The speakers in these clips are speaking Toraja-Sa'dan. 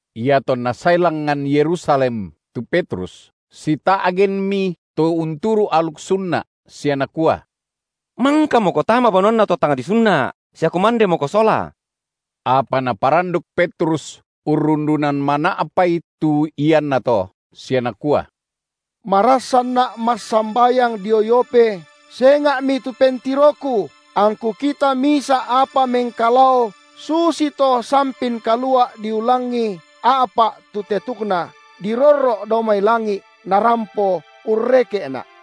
Iatonna sae langngan Yerusalem tu Petrus, sita’genmi to unturu’ aluk sunna’, sia nakua: Mangkamoko tama banuanna to tang disunna’ sia kumandemoko sola. Apa naparanduk Petrus urrundunan mana’pai tu iannato, sia nakua: Marassanna’ massambayang dio Yope, senga’mi tu pentiroku, angku kita misa’ apa mengkalao susito sampin kalua’ diulangi a’pa’ tu tetukna dirorro’ dao mai langi’, narampo urreke’na’.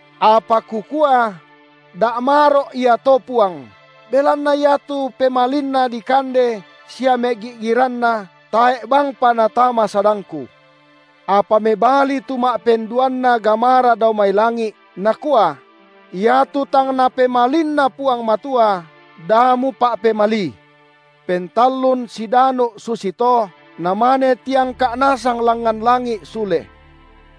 Apa kukua: Da’ maro’ ia to Puang, belanna iatu pemalinna dikande sia megi’giranna tae’ bangpa natama sadangku. Apa mebali tu ma’penduanna gamara dao mai langi’, nakua: Iatu tang Napa’pemalinna Puang Matua, da mupa’pemalii. Pentallun sidanu’ susito, namane tiangka’ nasang langngan langi’ sule.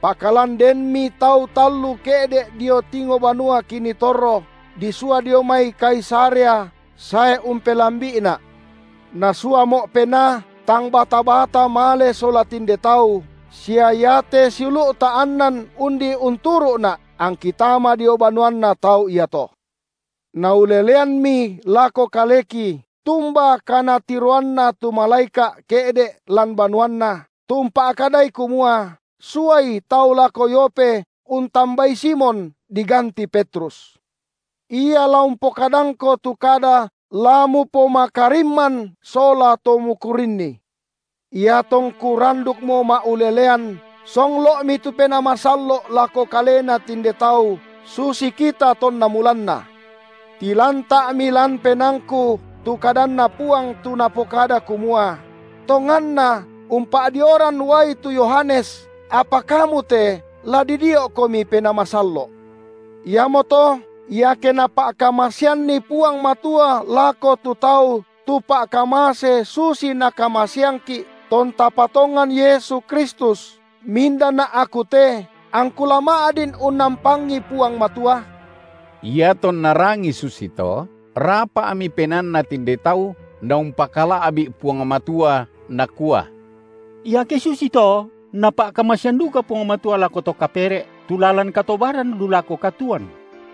Pakalan denmi tau tallu ke’de’ dio tingo banua kinii torro, disua dio mai Kaisarea sae umpellambi’ina’. Nasuamo’ Penaa, tang bata-bata male sola tinde tau, sia iate siulu’ta annan undi unturu’na’, angki tama dio banuanna tau iato. Nauleleanmi lako kaleki tumba kanatiroanna tu malaeka’ ke’de’ lan banuanna, tu umpa’kadai kumua: suai tau lako Yope untambai Simon diganti Petrus; ia la umpokadangko tu kada la mupomakarimman sola to mukurinni. Iatongku randukmo ma’ulelean, songlo’mi tu Penaa Masallo’ lako kalena tinde tau susi kita tonna mulanna. Tilanta’mi lan penaangku tu kadanNa Puang tu Napokada kumua: Tonganna umpa’dioran uai tu Yohanes, apa kamu te la didio’komi Penaa Masallo’. Iamoto, iake Napa’kamaseanni Puang Matua lako tu tau tu pa’kamase susi Nakamaseangki’, tonta patongan Yesu Kristus, mindana’ aku te, angku la ma’din unnampangi Puang Matua? Iatonna rangii susito, rapa’mi penaanna tinde tau’ naumpakala’bi’ Puang Matua nakua: Iake susito, Napa’kamasean duka Puang Matua lako to kapere’ tu lalan katobaran lu lako katuoan.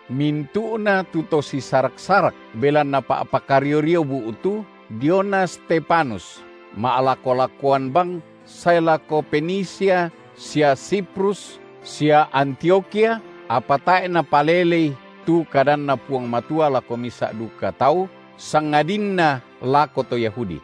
Mintu’na tu to sisarak-sarak belanna pa’pakario-rio bu’tu, diona Stefanus, ma’lako-lakoan bang sae lako Fenisia sia Siprus sia Antiokhia, apa tae’ napalelei tu kadanNa Puang Matua lako misa’ duka tau sangadinna lako to Yahudi.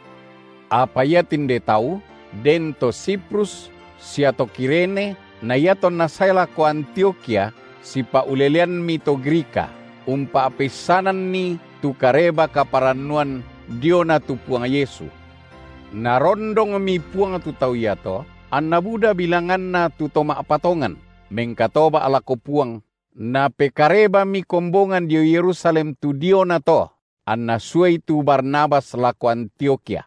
Apa iatinde tau den to Siprus sia to Kirene, na iatonna sae lako Antiokhia sipa’uleleanmi to Grika, umpa’peissananni tu Kareba-kaparannuan diona tu Puang Yesu. Narondongmi Puang tu tau iato, anna buda bilanganna tu to ma’patongan, mengkatoba’ lako Puang, Napekarebami kombongan dio Yerusalem tu diona to, anna suai tu Barnabas lako Antiokhia.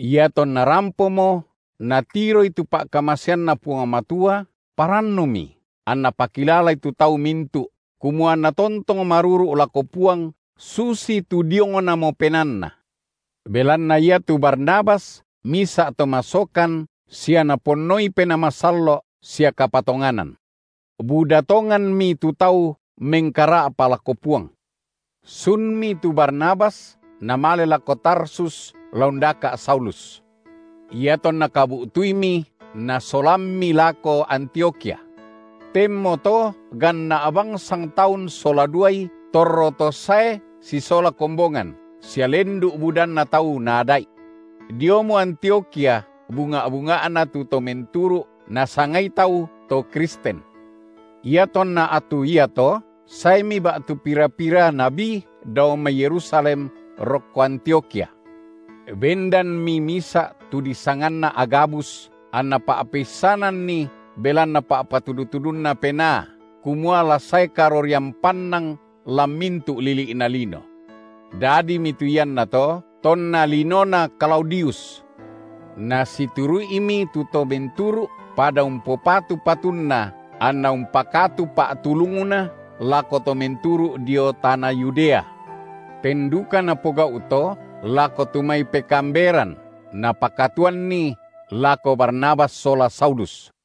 Iatonna rampomo, natiroi tu pa’kamaseanNa Puang Matua, parannumi, anna pakilalai tu tau mintu’, kumua anna tontong maruru’ lako Puang susitu diongnamo penaanna. Belanna iatu Barnabas misa’ to masokan sia Naponnoi Penaa Masallo’ sia kapatonganan. Buda tonganmi tu tau mengkara’pa lako Puang. Sunmi tu Barnabas namale lako Tarsus la undaka’ Saulus. Iatonna kabu’tuimi, nasolammi lako Antiokhia. Tenmoto ganna’ bang sangtaun sola duai torro to sae sisola kombongan, sia lendu’ budanna tau naada’i. Diomo Antiokhia bunga’-bunga’na tu to menturu’ nasangai tau to Kristen. Iatonna attu iato saemi ba’tu pira-pira nabi dao mai Yerusalem rokko Antiokhia. Bendanmi misa’ tu disanganna Agabus, anna pa’peissananni belanna pa’patudu-tudunNa Penaa, kumua la sae karorian pannang lan mintu’ lili’na lino. Dadimi tu iannato tonna linona Klaudius. Nasituru’imi tu to menturu’ pada umpopatu patunna anna umpakatu pa’tulungna lako to menturu’ dio tana Yudea. Ten duka napogau’ to, lako tu mai pekaamberan, napakatuanni, lako Barnabas sola Saulus.